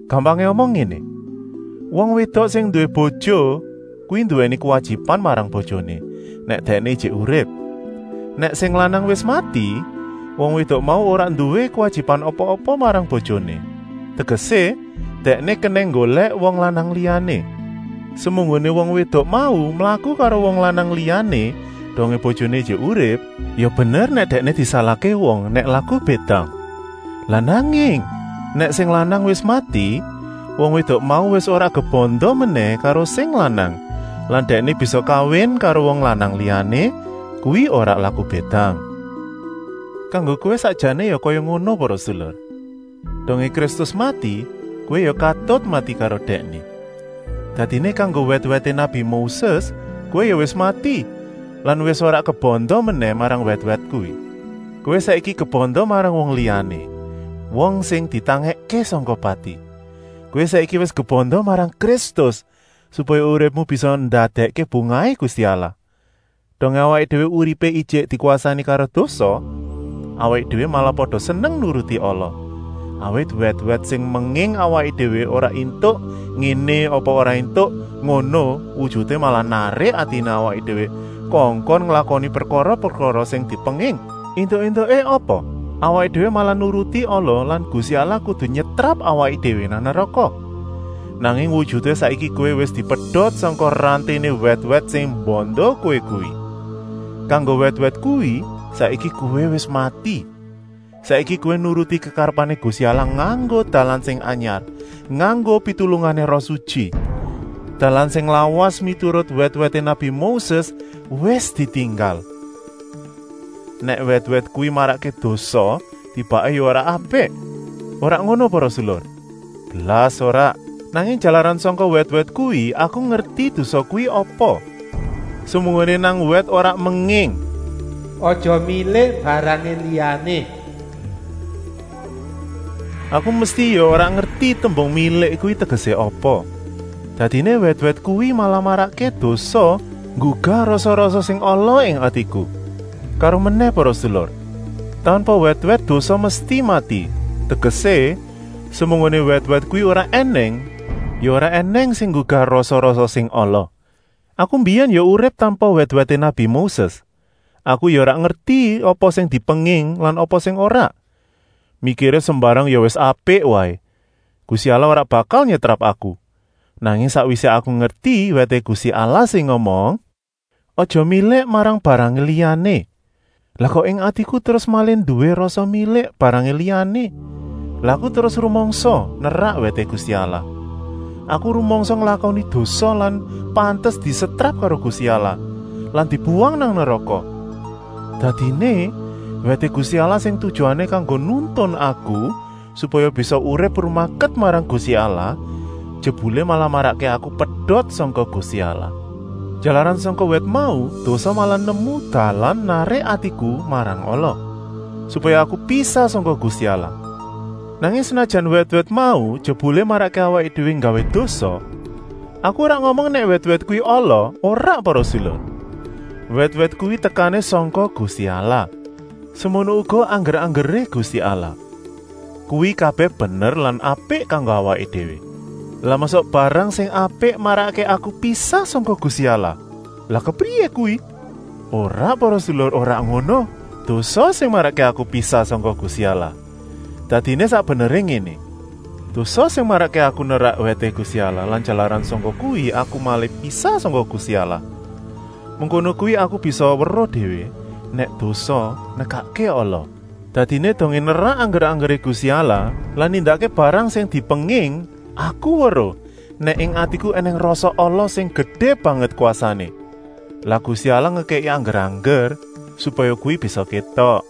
Gampangé omong ngéné. Wong wédok sing nduwé bojo kuwi nduwèni kuwajiban marang bojoné, nèk dèkné ijik urip. Nèk sing lanang wis mati, wong wédok mau ora nduwé kuwajiban apa-apa marang bojoné, tegesé, dèkné kenèng nggolèk wong lanang liyané. Semunggoné wong wédok mau mlaku karo wong lanang liyané dongé bojoné ijik urip, ya bener nèk dèkné disalahké wong nèk laku bédang. Lah nanging nèk sing lanang wis mati, wong wédok mau wis ora kebanda menèh karo sing lanang lan dèkné bisa kawin karo wong lanang liyané, kuwi ora laku bédang. Kanggo kowé sakjané ya kaya ngono para sedulur! Dongé Kristus mati, kowé ya katut mati karo Dèkné. Dadiné kanggo wèt-wèté nabi Moses kowé ya wis mati lan wis ora kebanda menèh marang wèt-wèt kuwi. Kowé saiki kebanda marang wong liyané, wong sing wis ditangèkké sangka pati. Kowé saiki wis kebanda marang Kristus, supaya uripmu bisa ndadèkké bungahé Gusti Allah. Dongé awaké déwé uripé ijik dikwasani karo dosa, awaké déwé malah pada seneng nuruti ala, awit wèt-wèt sing menging awaké déwé ora éntuk ngéné apa ora éntuk ngono wujuté malah narik atiné awaké déwé kongkon nglakoni prekara-prekara sing dipenging. Entuk-éntuké apa? Awaké déwé malah nuruti ala lan Gusti Allah kudu nyetrap awaké déwé nang neraka. Nanging wujuté saiki kowé wis dipedot sangka ranténé wèt-wèt sing mbanda kowé kuwi. Kanggo wèt-wèt kuwi saiki kowé wis mati. Saiki kowé nuruti kekarepané Gusti Allah nganggo dalan sing anyar, nganggo pitulungané Roh Sutyi. Dalan sing lawas, miturut wèt-wèté nabi Moses, wis ditinggal. Nèk wèt-wèt kuwi marakké dosa, tibaké ya ora apik? Ora ngono para sedulur, blas ora. Nanging jalaran sangka wèt-wèt kuwi aku ngerti dosa kuwi apa. Semunggoné nang wèt ora menging: “Aja milik barangé liyané,” aku mesti ya ora ngerti tembung milik kuwi tegesé apa. Dadiné wèt-wèt kuwi malah marakké dosa nggugah rasa-rasa sing ala ing atiku. Karomenèh para sedulur, tanpa wèt-wèt dosa mesti mati, tegesé, semunggoné wèt-wèt kuwi ora ènèng, ya ora ènèng sing nggugah rasa-rasa sing ala. Aku mbiyèn ya urip tanpa wèt-wèté nabi Moses, aku ya ora ngerti apa sing dipenging lan apa sing ora. Mikiré sembarang ya wis apik waé, Gusti Allah ora bakal nyetrap aku. Nanging sakwisé aku ngerti wèté Gusti Allah sing ngomong: “Aja milik marang barangé liyané,” lah kok ing atiku terus malih nduwé rasa milik barangé liyané. Lah aku terus rumangsa nerak wèté Gusti Allah. Aku rumangsa nglakoni dosa lan pantes disetrap karo Gusti Allah lan dibuwang nang neraka. Dadiné, wèté Gusti Allah sing tujuané kanggo nuntun aku supaya bisa urip rumaket marang Gusti Allah, jebulé malah marakké aku pedot sangka Gusti Allah. Jalaran sangka wèt mau dosa malah nemu dalan narik atiku marang ala, supaya aku pisah sangka Gusti Allah. Nanging senajan wèt-wèt mau jebulé marakké awaké déwé nggawé dosa, aku ora ngomong nèk wèt-wèt kuwi ala, ora para sedulur. Wèt-wèt kuwi tekané sangka Gusti Allah. Semono uga angger-anggeré Gusti Allah. Kuwi kabèh bener lan apik kanggo awaké déwé. Lah mosok barang sing apik marakké aku pisah sangka Gusti Allah? Lah kepriyé kuwi? Ora para sedulur, ora ngono! Dosa sing marakké aku pisah sangka Gusti Allah. Dadiné sak beneré ngéné: dosa sing marakké aku nerak wèté Gusti Allah lan jalaran sangka kuwi aku malih pisah sangka Gusti Allah. Mengkono kuwi aku bisa weruh déwé, nèk dosa nekakké ala. Dadiné dongé nerak angger-anggeré Gusti Allah lan nindakké barang sing dipenging, aku weruh, nèk ing atiku ènèng rasa ala sing gedé banget kwasané. Lah Gusti Allah ngekèki angger-angger, supaya kuwi bisa kétok.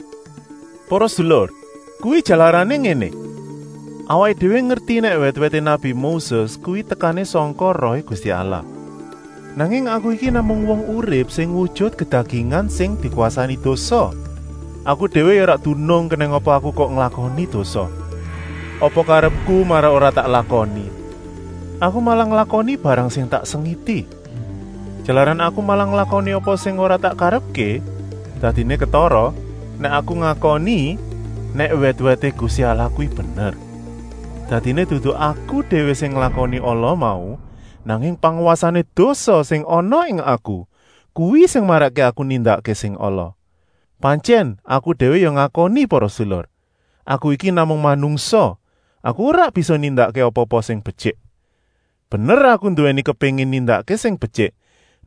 Para sedulur, kuwi jalarané ngéné: awaké déwé ngerti nèk wèt-wèté nabi Moses kuwi tekané sangka Rohé Gusti Allah. Nanging aku iki namung wong urip sing wujut kedagingan sing dikwasani dosa. Aku déwé ya ora dunung kenèng apa aku kok nglakoni dosa. Apa karepku malah ora tak lakoni, aku malah nglakoni barang sing tak sengiti. Jalaran aku malah nglakoni apa sing ora tak karepké, dadiné ketara, nèk aku ngakoni, nèk wèt-wèté Gusti Allah kuwi bener. Dadiné dudu aku déwé sing nglakoni ala mau, nanging pangwasané dosa sing ana ing aku, kuwi sing marakké aku nindakké sing ala. Pantyèn aku déwé ya ngakoni para sedulur, aku iki namung manungsa, aku ora bisa nindakké apa-apa sing betyik. Bener aku nduwèni kepéngin nindakké sing betyik,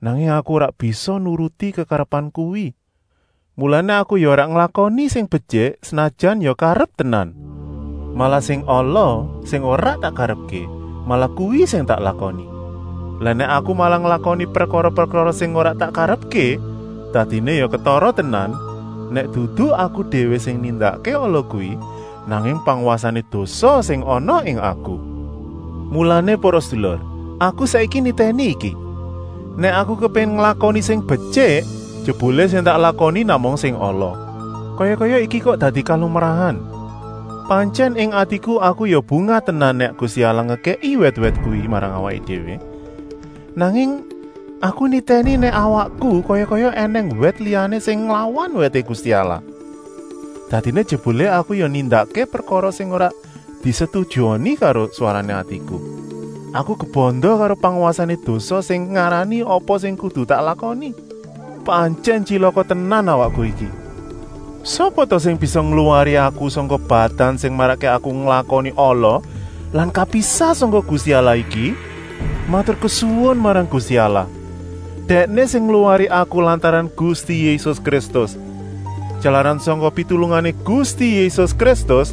nanging aku ora bisa nuruti kekarepan kuwi. Mulané aku ya ora nglakoni sing betyik, senajan ya karep tenan. Malah sing ala, sing ora tak karepké, malah kuwi sing tak lakoni. Lah nèk aku malah nglakoni prekara-prekara sing ora tak karepké, dadiné ya ketara tenan, nèk dudu aku déwé sing nindakké ala kuwi, nanging pangwasané dosa sing ana ing aku. Mulané para sedulur, aku saiki nitèni iki: nèk aku kepéngin nglakoni sing betyik, jebulé sing tak lakoni namung sing ala. Kaya-kaya iki kok dadi kalumrahan. Pantyèn ing atiku aku ya bungah tenan nèk Gusti Allah ngekèki wèt-wèt kuwi marang awaké déwé. Nanging aku nitèni nèk nang awakku kaya-kaya ènèng wèt liyané sing nglawan wèté Gusti Allah. Dadiné jebulé aku ya nindakké prekara sing ora disetujoni karo swarané atiku. Aku kebanda karo pangwasané dosa sing ngarani apa sing kudu tak lakoni. Pantyèn tyilaka tenan awakku iki. Sapa ta sing bisa ngluwari aku sangka badan sing marakké aku nglakoni ala lan kapisah sangka Gusti Allah iki? Maturkesuwun marang Gusti Allah! Dèkné sing ngluwari aku lantaran Gusti Yésus Kristus. Jalaran sangka pitulungané Gusti Yésus Kristus,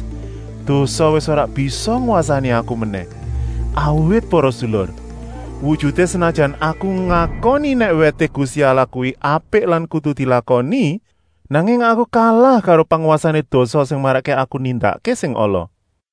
dosa wis ora bisa ngwasani aku menèh. Awit para sedulur, wujuté senajan aku ngakoni nèk wèté Gusti Allah kuwi apik lan kudu dilakoni, nanging aku kalah karo pangwasané dosa sing marakké aku nindakké sing ala.